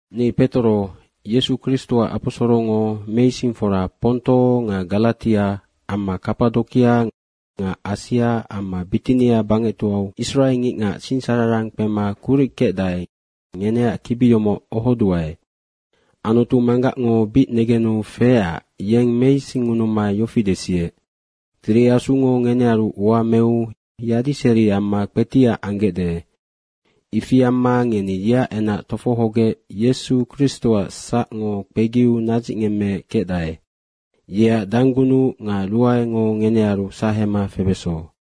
Ni Petoro, Yesu Kristoac aposorongo meisingfora Ponto nga Garatia amma Kapadokia nga Asia amma Bitinia bangectoau israengicngac singsararang kpema kuric kecdae, ngeneac kibi yomoc ohoduae. Anutu Manggacngo bic negenu feecac yeng meisingngunuma yofi desiec, Tiri Asungo ngenearu ua meu yadiseri amma kpetiac anggecde. Ifi amma ngeni yeac enac tofohogec Yesu Kristoac sacngo kpegiu nadzicngemmeec kecdae. Yeac danggunuc nga ruaengo ngenearu sahema febeso.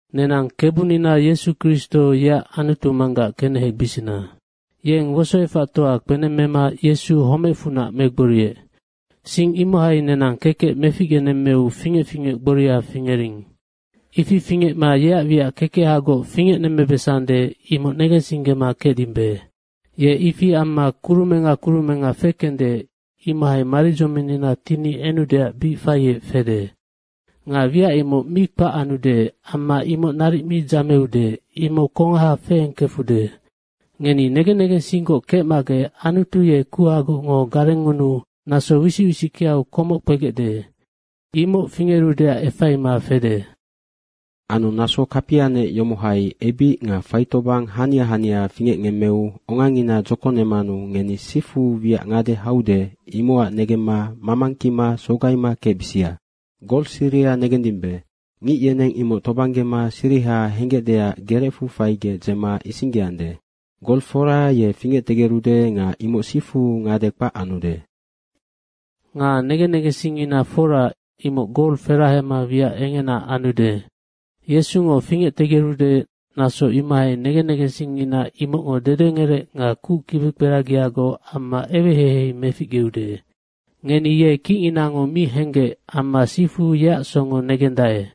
Nenang Kebunina Yesu Kristo, yeac Anutu Manggac kenehebisina. Yeng wosoefactoa kpenemmema Yesu homecfunac megboriec. Sing imohai nenang kekec meficgenemmeu fingec fingec gboria fingering. Ifi fingecma yeac wiac kekehagoc fingecnemmebesande, imoc negensinggema kecdimbe. Ye ifi amma kurumenga kurumenga fekende, imohai maridzominnina tini enudeac bic faiec fede. Nga wiac imoc mi kpac anude amma imoc naric mi dzameude, imoc kongaha feengkefude. Ngeni negen negensinggoc kecmagec Anutu ye kuhagocngo garengngunuu naso wisic wisickeau komoc kpegecde. Imoc fingerudeac efaima fede. Anu naso kapianec yomohai ebic nga faitobang hania hania fingecngemmeu ongangina dzokonemanu ngeni sifu wiac ngade haude, imocac negemma mamangkima sogaima kecbisia. Gol siriha negendimbe. Ngic yeneng imoc tobanggema siriha henggecdeac gerecfu faigec dzema isinggeandae. Gol fora ye fingectegerude nga imoc sifu ngade kpac anude. Nga negen negensingngina fora, imoc gol ferahema wiac engena anude. Yesungo fingectegerude, naso imohai negen negensingngina imocngo dedengerec nga kuc kibikperagiagoc amma eweheihei meficgeude. Ngeni ye kicnginango mi henggec amma sifu yeac songo negendae.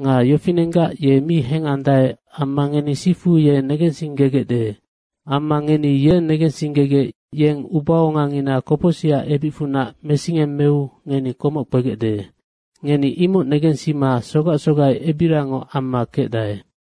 Nga yofinenggac ye mi hengandae amma ngeni sifu ye negensinggegecde. Amma ngeni ye negensinggegec, yeng ubaongangina kopocsicac ebicfunac mesingemmeu ngeni komoc kpegecde. Ngeni imoc negensima sogac sogai ebiriangoc amma kecdae.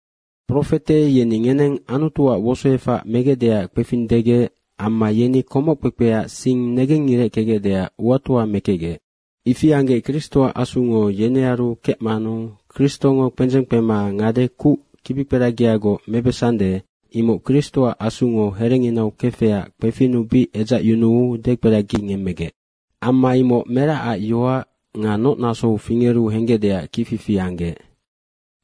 Profete yeni ngeneng Anutuac wosoefac megecdeac kpefing degec amma yeni komoc kpekpea sing negengireckegecdeac uatoa mekecgec. Ifi anggec Kristoac Asungo yenearu kecmanu Kristongo kpendzeng kpema ngade kuc kibikperagiagoc mebesande, imoc Kristoac Asungo herenginau kefecac kpefinnu bic edzacyunuu dekperagingemmegec. Amma imoc meracac yoac nga noc nasou fingeru henggecdeac kicfifi anggec.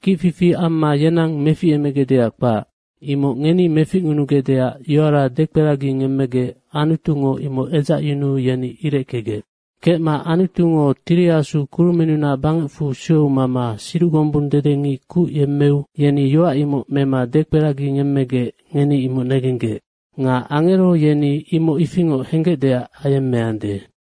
Kicfifi amma yenang meficemegecdeac kpac, imoc ngeni meficngunugecdeac yoara dekperagingemmegec, Anutungo imoc edzacyunuu yeni ireckegec. Kecma Anutungo Tiri Asu kurumennunac bangecfu sueu mama siduc gombung dedengic kuc yemmeu, yeni yoac imoc mema dekperagingemmegec ngeni imoc negenggec. Nga Angero yeni imoc ifingoc henggecdeac ayemmeande.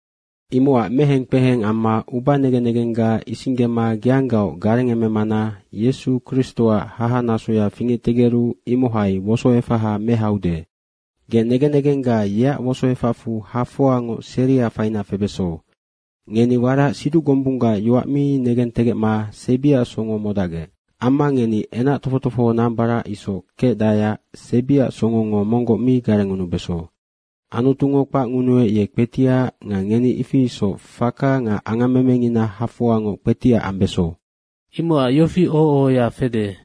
Imocac meheng kpeheng amma ubanegen negengga isinggema geanggaoc garengememana Yesu Kristoac hahanasoya fingectegeru imohai wosoefaha mehaude, ge negen negengga yeac wosoefacfu hafoangoc seria faina febeso. Ngeni warac siduc gombunggac yoac mi negentegecma sebiac songo modacgec. Amma ngeni enac tofoc tofoho nambarac isoc kecdaeac sebiac songongo monggoc mi garengngunubeso. Anutungo kpacngunuec, ye kpetiac nga ngeni ifi isoc faka nga angammemengina hafoangoc kpetiac ambeso. Imocac yofi oho ohoya fede,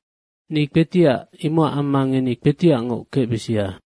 “Ni kpetiac, imocac amma ngeni kpetiacngoc kecbisia.”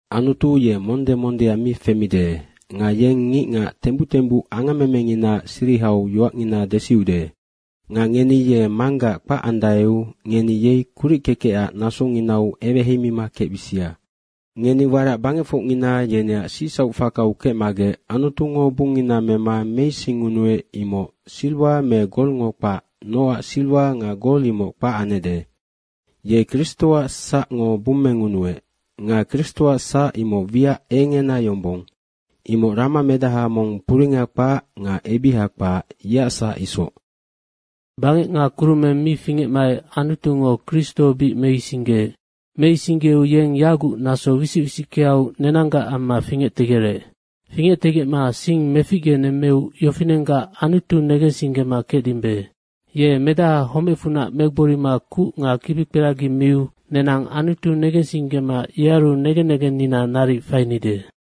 Anutu ye monde mondea mi femide nga yeng ngicngac tembuc tembuc angammemenginaac sirihau yoacngina desiude. Nga ngeni ye “Manggac” kpacandaeu, ngeni yei kurickekecac nasonginau eweheimima kecbisia. Ngeni warac bangecfocngina yeneac sicsauc fakau kecmagec Anutungo bungngina mema meisingunuec, imoc siriwa me golngo kpac nocac siriwa nga gol imoc kpac anecde. Ye Kristoac sacngo bumengunuec. Nga Kristoac sac imoc wiac engena yombong, imoc rama medaha mong puringa kpac nga ebiha kpac, yeac sac isoc. Bangec nga kurumeng mi fingecmaec Anutungo Kristo bic meisinggeec. Meisinggeu yeng yaguc naso wisic wisickeau nenanggac amma fingectegerec. Fingectegecma sing meficgenemmeu yofinenggac Anutu negensinggema kecdimbe. Ye medaha homecfunac megborima kuc nga kibikperagi miu nenang Anutu negensinggema yearu negen negennina naric fainide.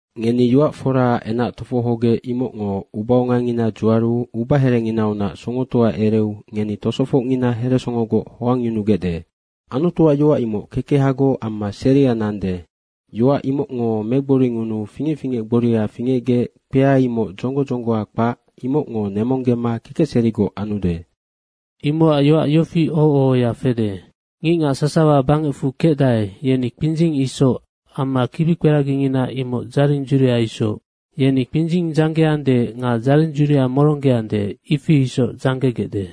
Ngeni yoac foraac enac tofohogec, imocngo ubaongangina dzuaru ubaherenginaunac songotoa ereu ngeni tosofocngina heresongogoc hoangyunugecde. Anutuac yoac imoc kekehagoc amma seria nande. Yoac imocngo megboringunuu fingec fingec gboria fingecgec. Kpea imoc dzonggo dzonggoa kpac imocngo nemonggema kekecserigoc anude. Imocac yoac yofi oho ohoya fede, “Ngicngac sasawa bangecfu kecdae, yeni kpindzing isoc amma kibikperagingina imoc dzaring dzuria isoc. Yeni kpindzing dzanggeande nga dzaring dzuria moronggeande, ifi isoc dzanggegecde.”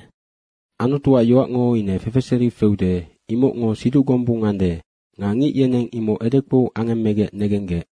Anutuac yoacngo ine fefeseri feude. Imocngo siduc gombung ande nga ngic yeneng imoc edekpou angemmegec negenggec.